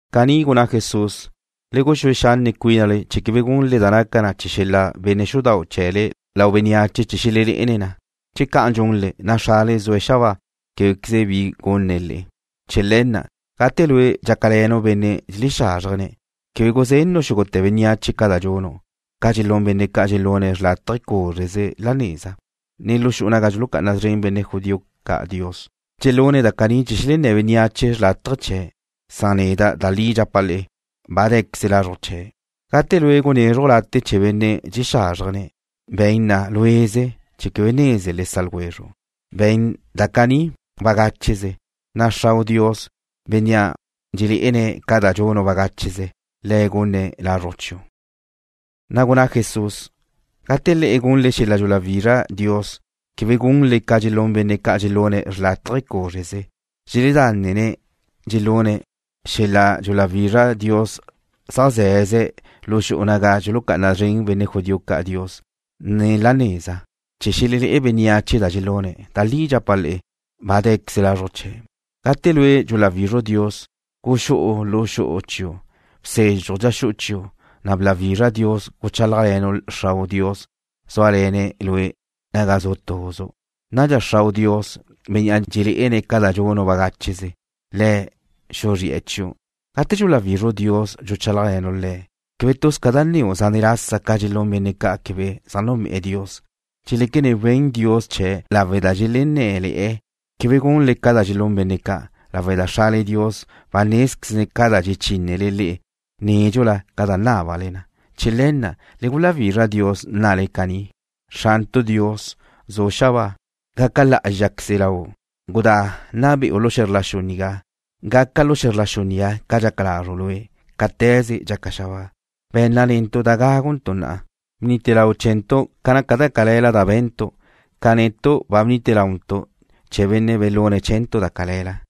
Caní gunná Jesús: ―Le guxúe xanne' cuínale chee̱ quebe gunle da naca chee̱ xel-la' benne' xudau' chee̱le lau bénneache chee̱ xelelé'ene̱' na. Che ca'an dxunle, na' Xrale Dios zue̱' xabáa québequeze bi gunne̱' le'e. Chee̱ le̱ na', gate lue' dxácale̱nu' benne' dxelexázrjene̱', quebe guzennu' xúgute̱ bénneache ca da dxunu', ca dxelún benne' ca' dxelune̱' xrlátaje cúzreze la neza, ne lu xu'u naga dxulucá'ana szren benne' judío ca' Dios. Dxelune̱' da caní chee̱ xelenné̱ bénneache xrlátaje chee̱'. Da li dxapa' le'e, ba dé̱queze lazruj chee̱'. Gate lue' gunézruju' late' chee̱ benne' dxelexázrjene̱', be̱n na luéze chee̱ quebe neze le sa' ljwezru'. Be̱n da caní bagácheze, na' Xrau' Dios, Bénnea' dxelé'ene̱' ca da dxunu' bagácheze, Le̱' gunne̱' lazruj chiu'. Na' gunná Jesús: ―Gate le'e gunle xel-la' dxuláwizra Dios, quebe gunle ca dxelún benne' ca' dxelune̱' xrlátaje cúzreze. Dxeledánene̱' dxelune̱' xel-la' dxuláwizra Dios zaj ze̱ze̱' lu xu'u naga dxulucá'ana szren benne' judío ca' Dios, ne la neza, chee̱ xelelé'e bénneache da dxelune̱'. Da li dxapa' le'e, ba dé̱queze lazruj chee̱'. Gate lue' dxuláwizru' Dios, guxú'u lu xu'u chiu'. Bsezxuj dxa xu'u chiu', na' bláwizra Dios guchálajle̱nu' Xrau' Dios zúale̱ne̱' lue' naga zu' tuzu'. Nadxa Xrau' Dios, Bénnea' dxelé'ene̱' ca da dxunu' bagácheze, Le̱' xuzri'e̱ chiu'. ’Gate dxuláwizru' Dios dxuchálajle̱nu' Le̱', quebe tuz ca da nneu' zánete̱ lasa ca dxelún benne' ca' quebe zaj núnbe'e̱ Dios. Dxeléquene̱' wen Dios chee̱' lawe' da dxelenné̱le̱'e̱. Quebe gunle ca dxelún benne' ca', lawe' da Xrale Dios ba nézquezne̱' ca da dxechínnele le'e nédxula ca za nábale na. Chee̱ le̱ na', le guláwizra Dios nnale caní: Xrantu' Dios, zu' xabáa, gaca lá'azxaqueze Lau'. Gudá nna be'u lu xe̱zr la xu nigá. Gaca lu xe̱zr la xu nigá ca dxaca lazru' Lue', cáte̱ze dxaca xabáa. Be̱nna netu' da gáguntu' na'a. Bnite lau chee̱ntu' ca naca da cale̱la da be̱ntu', ca netu' ba bnite launtu' chee̱ benne' belune̱' chee̱ntu' da cale̱la.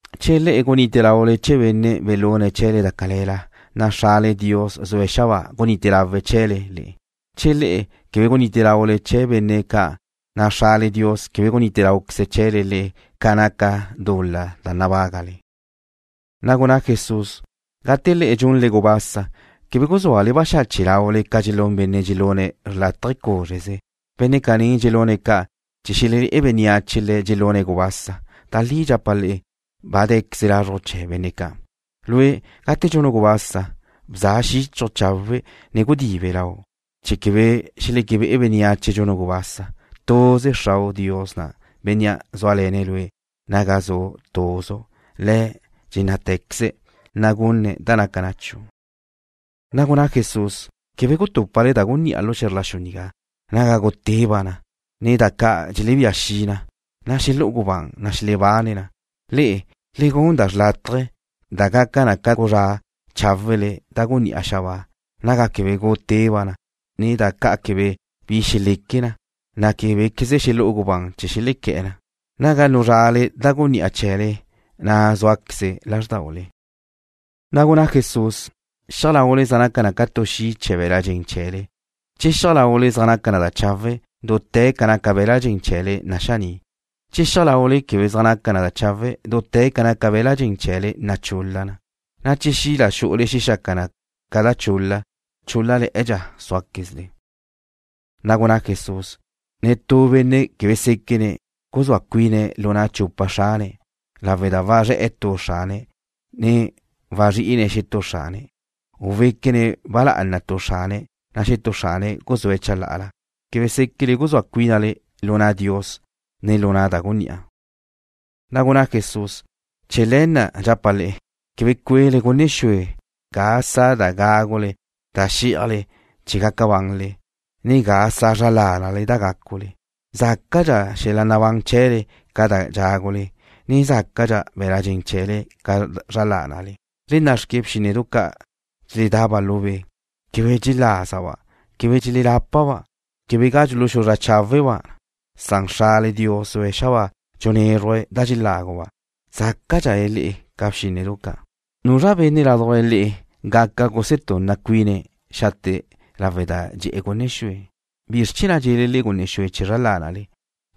’Che le'e gunite laule chee̱ benne' belune̱' chee̱le da cale̱la, na' Xrale Dios zue̱' xabáa gunite lawe̱' chee̱le le'e. Che le'e quebe gunite laule chee̱ benne' ca', na' Xrale Dios quebe gunite láuqueze̱' chee̱le le'e ca naca dul-la da nabágale. Na' gunná Jesús: ―Gate le'e dxunle gubasa, quebe guzúale baxache' laule ca dxelún benne' dxelune̱' xrlátaje cúzreze. Benne' caní dxelune̱' ca' chee̱ xelelé'e bénneache le̱' dxelune̱' gubasa. Da li dxapa' le'e, ba dé̱queze lazruj chee̱ benne' ca'. Lue', gate dxunu' gubasa, bza xíchaju' chawe', ne gudibe lau', chee̱ quebe xeléquebe'e bénneache dxunu' gubasa. Tuze Xrau' Dios na', Bénnea' zúale̱ne̱' lue' naga zu' tuzu', Le̱' dxennátequeze̱', na' gunne̱' da naca na chiu'. Na' gunná Jesús: ―Quebe gutúpale da gunní'a lu xe̱zr la xu nigá, naga guteba' na, ne da ca' dxelebía xi na, na' xelú'u gubán ne xelebane̱' na. Le'e, le gun da xrlátaje, da gaca na ca guzrá cháwele da gunní'a xabáa, naga quebe guteba' na, ne da ca' quebe bi xeleque na, na' québequeze xelú'u gubán chee̱ xelequé̱'e̱ na. Naga nuzrale da gunní'a chee̱le, na' zúaqueze lázrdaule. Na' gunná Jesús: ―Xiaj laule zaj naca na ca tu xi' chee̱ be̱l-la' dxen chee̱le. Che xiaj laule zaj naca na chawe', dute̱ ca naca be̱l-la' dxen chee̱le naxaní'. Che xiaj laule quebe zaj naca na chawe', dute̱ ca naca be̱l-la' dxen chee̱le nachul-la na. Cá'anqueze che xi' da xu'ule xexaca na tu da chul-la, chúl-lale̱'e̱dxa súaquezle. Na' gunná Jesús: ―Netú benne' quebe séquene̱' guzúa cuine̱' lu na' chupa xrane̱', lawe' da wazré̱'e̱ tu xrane̱' ne wazrí'ine̱' xetúe̱', u wéquene̱' ba lá'ana tu xrane̱' na' xetúe̱' guzúe̱' chalá'ala. Quebe séquele guzúa cuinle lu na' Dios, ne lu na' da gunní'a. Na' gunná Jesús: ―Chee̱ le̱ na' dxapa' le'e, quebe cue'le gunne xue ga sa' da gágule da xí'ajle chee̱ gaca banle, ne ga sa' zra lánale da gácule. Zácadxa xel-la' nabán chee̱le ca da dxágule, ne zácadxa be̱l-la' dxen chee̱le ca zra lánale. Le nna'xque bxínnedu ca' dxeledaba' lu be'. Quebe dxelázaba'. Quebe dxelelápaba'. Quebe ga dxuluxuzrá cháweba' na. Xrale Dios zue̱' xabáa dxunézruje̱' da dxeláguba'. Zácadxale le'e ca bxínnedu ca'. ¿Nuzra benne' ládujla le'e gaca gusetunna cuine̱' xate' lawe' da dxe'e̱ gunne xue? ’¿Bizr chee̱ na' dxe'le le'e gunne xue chee̱ zra lánale?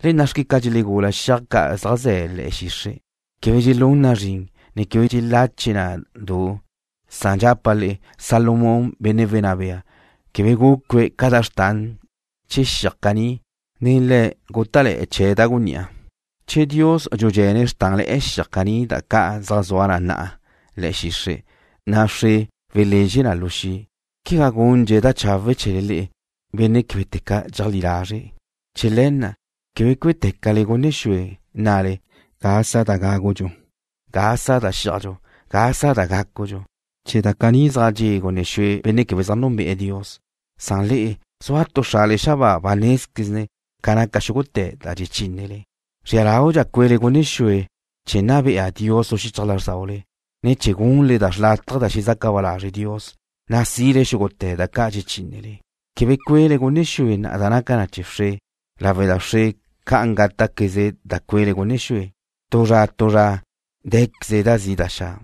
Le nna'xque ca dxelegula xiaj ca' zaj ze̱ le̱'e̱ xixre'. Quebe dxelún na zrin, ne quebe dxelache na du. Dxapa' le'e, Salomón benne' wenná bea na' quebe gucue̱' ca da xrtan chee̱ xiaj caní, na' le̱' gúta'le̱'e̱ chee̱' da gunní'a. Che Dios dxudxe̱ne̱' xrtánle̱'e̱ xiaj caní da ca' zaj zua na na'a le̱'e̱ xixre', na' wxre xelezxe na lu xi', quegá gundxe̱' da chawe' chee̱le le'e, benne' québete̱ ca dxeajlí lazre'. Chee̱ le̱ na', quebe cué'tecale gunne xue, nnale: “¿Ga sa' da gágudxu? ¿Ga sa' da xí'ajdxu? ¿Ga sa' da gácudxu?” Chee̱ da caní zaj dxe' gunne xue benne' quebe zaj núnbe'e̱ Dios, san le'e, zua tu Xrale xabáa ba nézquezne̱' ca naca xúgute̱ da dxechínnele. Zria laudxa cuele gunne xue chee̱ nna bea Dios lu xichaj lázrdaule, ne chee̱ gunle da xrlátaje da xezaca ba lazre' Dios, na' sile xúgute̱ da ca' dxechínnele. Quebe cuele gunne xue na'a da naca na chee̱ wxre, lawe' da wxre ca'an gáta'queze da cuele gunne xue. Tu zra tu zra dé̱queze da guchaga laudxu.